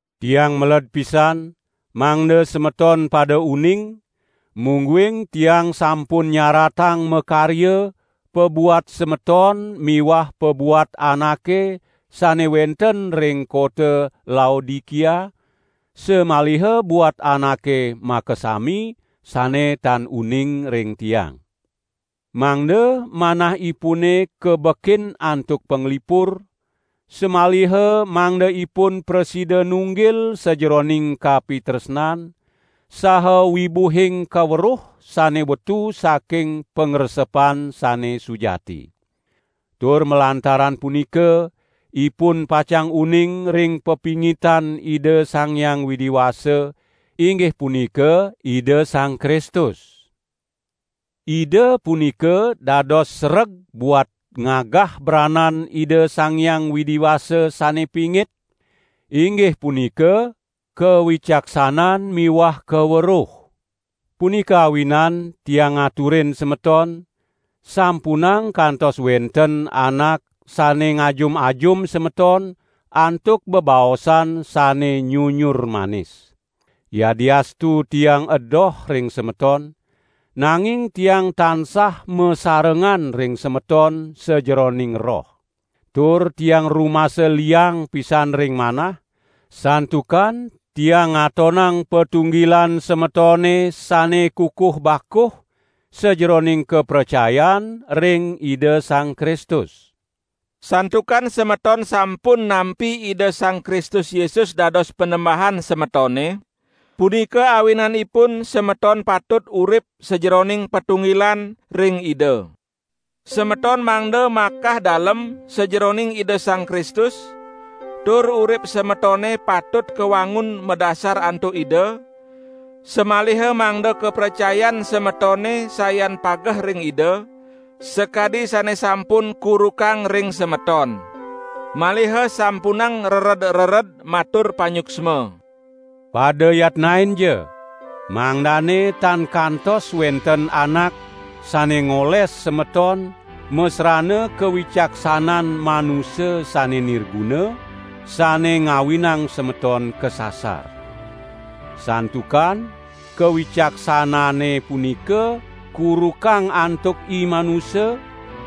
Tiang meled pisan, mangda semeton pada uning, mungguing tiang sampun nyaratang makarya pabuat semeton miwah pabuat anake sane wenten ring kota Laodikia, samaliha buat anake makasami, sane tan uning ring tiang. Mangda manahipune kabekin antuk panglipur, samaliha mangda ipun prasida nunggil sajeroning kapitresnan, saha wibuhing kaweruh sane wetu saking pangresepan sane sujati. Tur malantaran punika ipun pacang uning ring pepingitan Ida Sang Hyang Widi Wasa, inggih punika Ida Sang Kristus. Ida punika dados sereg buat ngagah branan Ida Sang Hyang Widi Wasa sane pingit, inggih punika kawicaksanan miwah kaweruh. Punika awinan tiang ngaturin semeton, sampunang kantos wenten anak sane ngajum-ajum semeton antuk bebaosan sane nyunyur manis. Yadiastu tiang edoh ring semeton, nanging tiang tansah masarengan ring semeton sajeroning roh. Tur tiang rumasa liang pisan ring manah, santukan tiang ngatonang patunggilan semetone sane kukuh bakuh sajeroning kapracayan ring Ida Sang Kristus. Santukan semeton sampun nampi Ida Sang Kristus Yesus dados Panembahan semetone, punika awinanipun semeton patut urip sajeroning patunggilan ring Ida. Semeton mangda makah dalem sajeroning Ida Sang Kristus tur urip semetone patut kawangun madasar antuk Ida, samaliha mangda kapracayan semetone sayan pageh ring Ida, sakadi sane sampun kurukang ring semeton. Maliha sampunang rered-rered matur panyuksma. Pada yatnainja, mangdane tan kantos wenten anak sane ngoles semeton masrana kawicaksanan manusa sane nirguna sane ngawinang semeton kasasar. Santukan kawicaksanane punika kurukang antuk imanusa,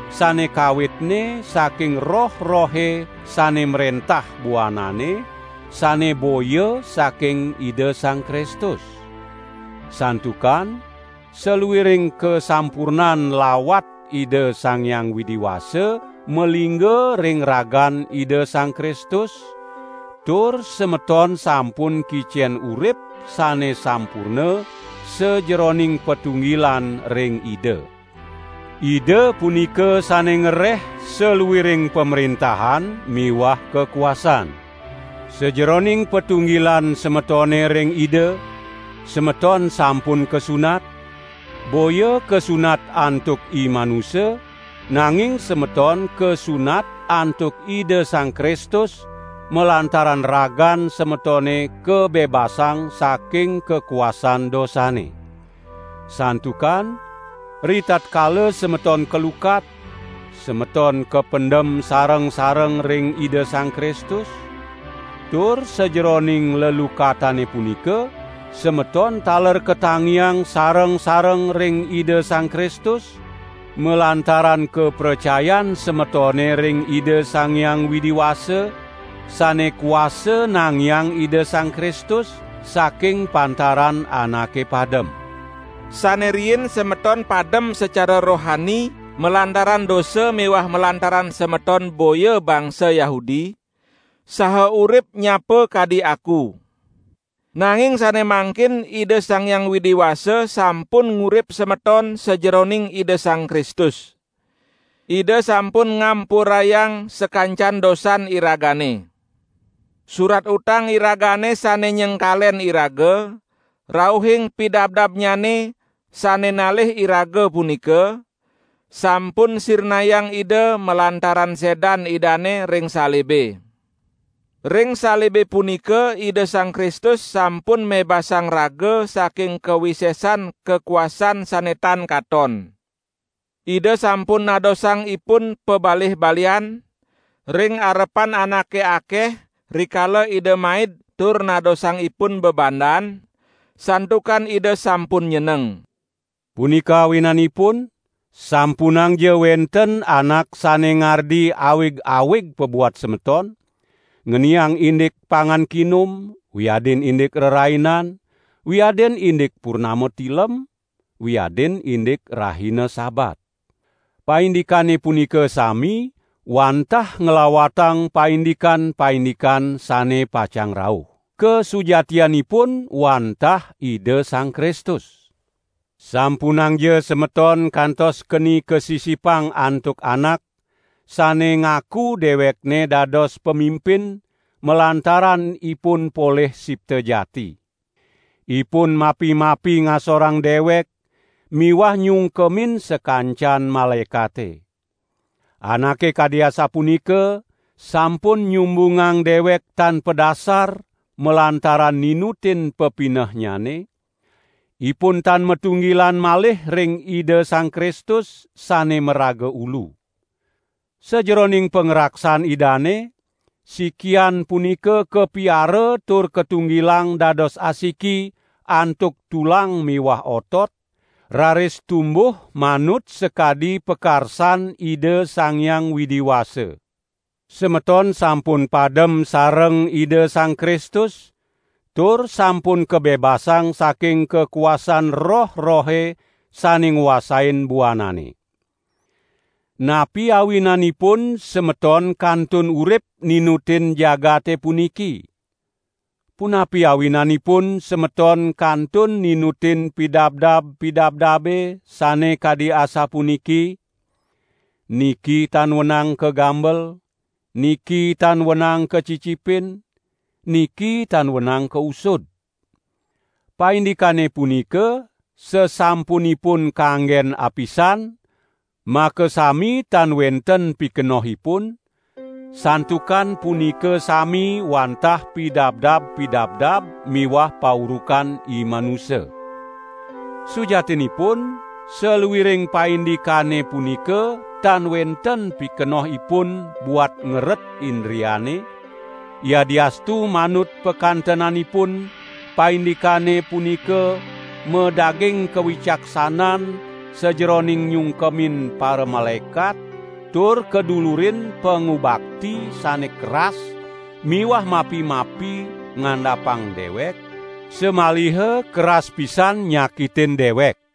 sane kawitne saking roh-rohe sane mrentah buanane, sane boya saking Ida Sang Kristus. Santukan saluiring kasampurnan lawat Ida Sang Hyang Widi Wasa malingga ring ragan Ida Sang Kristus, tur semeton sampun kicen urip sane sampurna sajeroning patunggilan ring Ida. Ida punika sane ngereh saluiring pamrentahan miwah kakuasan. Sajeroning patunggilan semetone ring Ida, semeton sampun kasunat, boya kasunat antuk imanusa, nanging semeton kasunat antuk Ida Sang Kristus malantaran ragan semetone kabebasang saking kakuasan dosane. Santukan ritatkala semeton kalukat, semeton kapendem sareng-sareng ring Ida Sang Kristus, tur sajeroning lelukatane punika, semeton taler katangiang sareng-sareng ring Ida Sang Kristus, malantaran kapracayan semetone ring Ida Sang Hyang Widi Wasa, sane kuasa nangiang Ida Sang Kristus saking pantaran anake padem. Sane riin semeton padem sacara rohani malantaran dosa miwah malantaran semeton boya bangsa Yahudi, saha urip nyapa kadi aku. Nanging sane mangkin Ida Sang Hyang Widi Wasa sampun ngurip semeton sajeroning Ida Sang Kristus. Ida sampun ngampurayang sakancan dosan iragane. Surat utang iragane sane nyengkalen iraga, rauhing pidabdabnyane, sane nalih iraga punika, sampun sirnayang Ida malantaran sedan Idane ring salibe. Ring salibe punika Ida Sang Kristus sampun mebasang raga saking kawisesan kakuasan sane tan katon. Ida sampun nadosang ipun pabalih-balihan ring arepan anake akeh rikala Ida maid tur nadosang ipun bebandan, santukan Ida sampun nyeneng. Punika awinanipun sampunangja wenten anak sane ngardi awig-awig pabuat semeton, ngeniang indik pangan kinum, wiadin indik rerainan, wiadin indik purnama tilem, wiadin indik rahina Sabat. Paindikane punika sami wantah nglawatang paindikan-paindikan sane pacang rauh. Kasujatianipun wantah Ida Sang Kristus. Sampunangja semeton kantos keni kasisipang antuk anak, sane ngaku dewekne dados pamimpin malantaran ipun polih sipta jati. Ipun mapi-mapi ngasorang dewek miwah nyungkemin sakancan malaekate. Anake kadi asapunika sampun nyumbungang dewek tan padasar malantaran ninutin pepinehnyane, ipun tan matunggilan malih ring Ida Sang Kristus, sane maraga Ulu. Sajeroning pangraksan Idane, sikian punika kapiara tur katunggilang dados asiki antuk tulang miwah otot, raris tumbuh manut sakadi pakarsan Ida Sang Hyang Widi Wasa. Semeton sampun padem sareng Ida Sang Kristus tur sampun kabebasang saking kakuasan roh-rohe sane nguasain buanane. Napi awinanipun semeton kantun urip ninutin jagate puniki? Punapi awinanipun semeton kantun ninutin pidabdab-pidabdabe sane kadi asapuniki: "Niki tan wenang kagambel", "Niki tan wenang kacicipin", "Niki tan wenang kausud"? Paindikane punika sasampunipun kanggen apisan makasami tan wenten pikenohipun, santukan punika sami wantah pidabdab-pidabdab miwah paurukan imanusa. Sujatinipun saluiring paindikane punika tan wenten pikenohipun buat ngeret indriane, yadiastu manut pakantenanipun paindikane punika madaging kawicaksanan sajeroning nyungkemin paramalaekat tur kadulurin pangubakti sane keras miwah mapi-mapi ngandapang dewek, samaliha keras pisan nyakitin dewek.